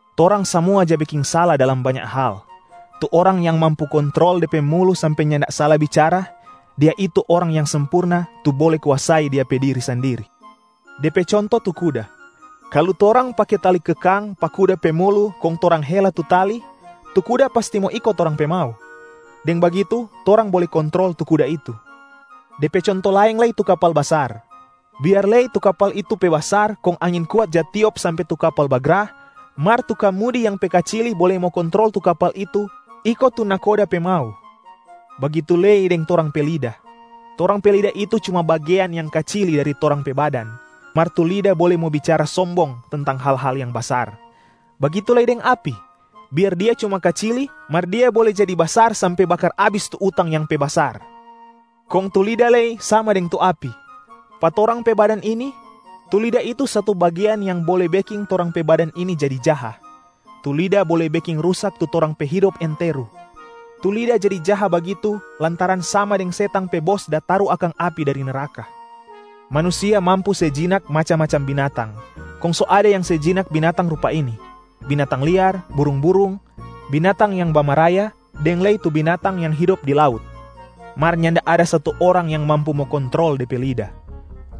Torang samua ja beking sala dalam banya hal. Tu orang yang mampu kontrol de pe mulu sampe nyanda sala bicara, dia itu orang yang sempurna, tu bole kuasai dia pe diri sandiri. De pe conto tu kuda: kalu torang pake tali kekang pa kuda pe mulu kong torang hela tu tali, tu kuda pasti mo iko torang pe mau. Deng bagitu torang bole kontrol tu kuda itu. De pe conto laeng lei tu kapal basar. Biar lei tu kapal itu pe basar kong angin kuat ja tiop sampe tu kapal bagra, mar tu kamudi yang pe kacili bole mo kontrol tu kapal itu iko tu nahkoda pe mau. Bagitu lei deng torang pe lida. Torang pe lida itu cuma bagean yang kacili dari torang pe badan, mar tu lida bole mo bicara sombong tentang hal-hal yang basar. Bagitu lei deng api, biar dia cuma kacili mar dia bole jadi basar sampe bakar abis tu utang yang pe basar. Kong tu lida lei sama deng tu api. Pa torang pe badan ini, tu lida itu satu bagean yang bole beking torang pe badan ini jadi jaha. Tu lida bole beking rusak tu torang pe hidop enteru. Tu lida jadi jaha bagitu lantaran sama deng setang pe bos da taru akang api dari neraka. Manusia mampu se jinak macam-macam binatang, kong so ada yang se jinak binatang rupa ini: binatang liar, burung-burung, binatang yang bamaraya deng lei tu binatang yang hidop di laut. Mar nyanda ada satu orang yang mampu mo kontrol de pe lida.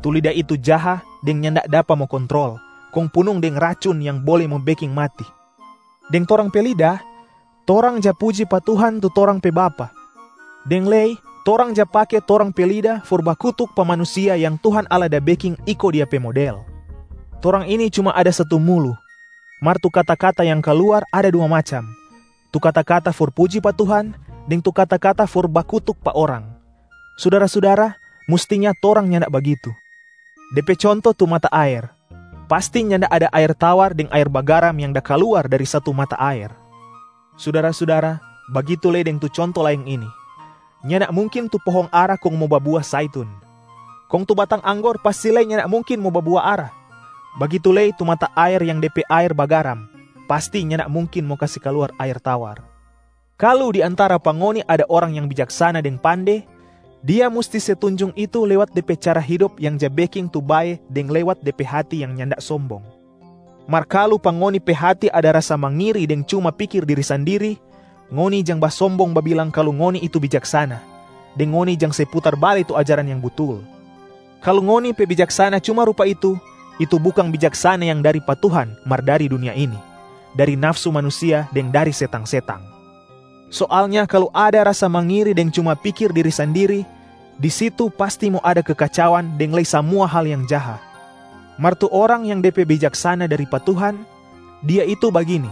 Tu lida itu jaha deng nyanda dapa mo kontrol, kong punung deng racun yang bole mo beking mati. Deng torang pe lida, torang ja puji pa Tuhan tu torang pe Bapa, deng lei torang ja pake tong pe lida for bakutuk pa manusia yang Tuhan Allah da beking iko Dia pe model. Torang ini cuma ada satu mulu mar tu kata-kata yang kaluar ada dua macam, tu kata-kata for puji pa Tuhan deng tu kata-kata for bakutuk pa orang. Sudara-sudara, mustinya torang nyanda bagitu. De pe conto tu mata aer, pasti nyanda ada aer tawar deng aer bagaram yang da kaluar dari satu mata aer. Sudara-sudara, bagitu lei deng tu conto laeng ini: nyanda mungkin tu pohong ara kong mo babua Zaitun. Kong tu batang anggor pasti lei nyanda mungkin mo babua ara. Bagitu lei tu mata aer yang de pe aer bagaram pasti nyanda mungkin mo kase kaluar aer tawar. Kalu di antara pa ngoni ada orang yang bijaksana deng pande, dia musti se tunjung itu lewat de pe cara hidop yang ja beking tu bae deng lewat de pe hati yang nyanda sombong. Mar kalu pa ngoni pe hati ada rasa mangiri deng cuma pikir diri sandiri, ngoni jang basombong babilang kalu ngoni itu bijaksana, deng ngoni jang se putar bale tu ajaran yang butul. Kalu ngoni pe bijaksana cuma rupa itu, itu bukang bijaksana yang dari pa Tuhan mar dari dunia ini, dari nafsu manusia deng dari setang-setang. Soalnya kalu ada rasa mangiri deng cuma pikir diri sandiri, di situ pasti mo ada kekacauan deng lei samua hal yang jaha. Mar tu orang yang de pe bijaksana dari pa Tuhan, dia itu bagini: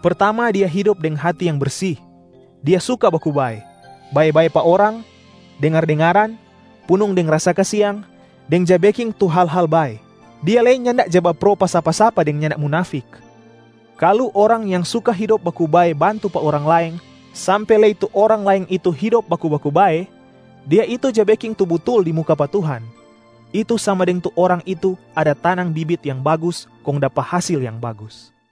pertama dia hidop deng hati yang bersi, dia suka baku bae, bae-bae pa orang, dengar-dengaran, punung deng rasa kasiang, deng ja beking tu hal-hal bae. Dia lei nyanda ja bapro pa sapa-sapa deng nyanda munafik. Kalu orang yang suka hidop baku bae bantu pa orang laeng sampe lei tu orang laeng itu hidop baku-baku bae, dia itu ja beking tu butul di muka pa Tuhan. Itu sama deng tu orang itu ada tanang bibit yang bagus kong dapa hasil yang bagus.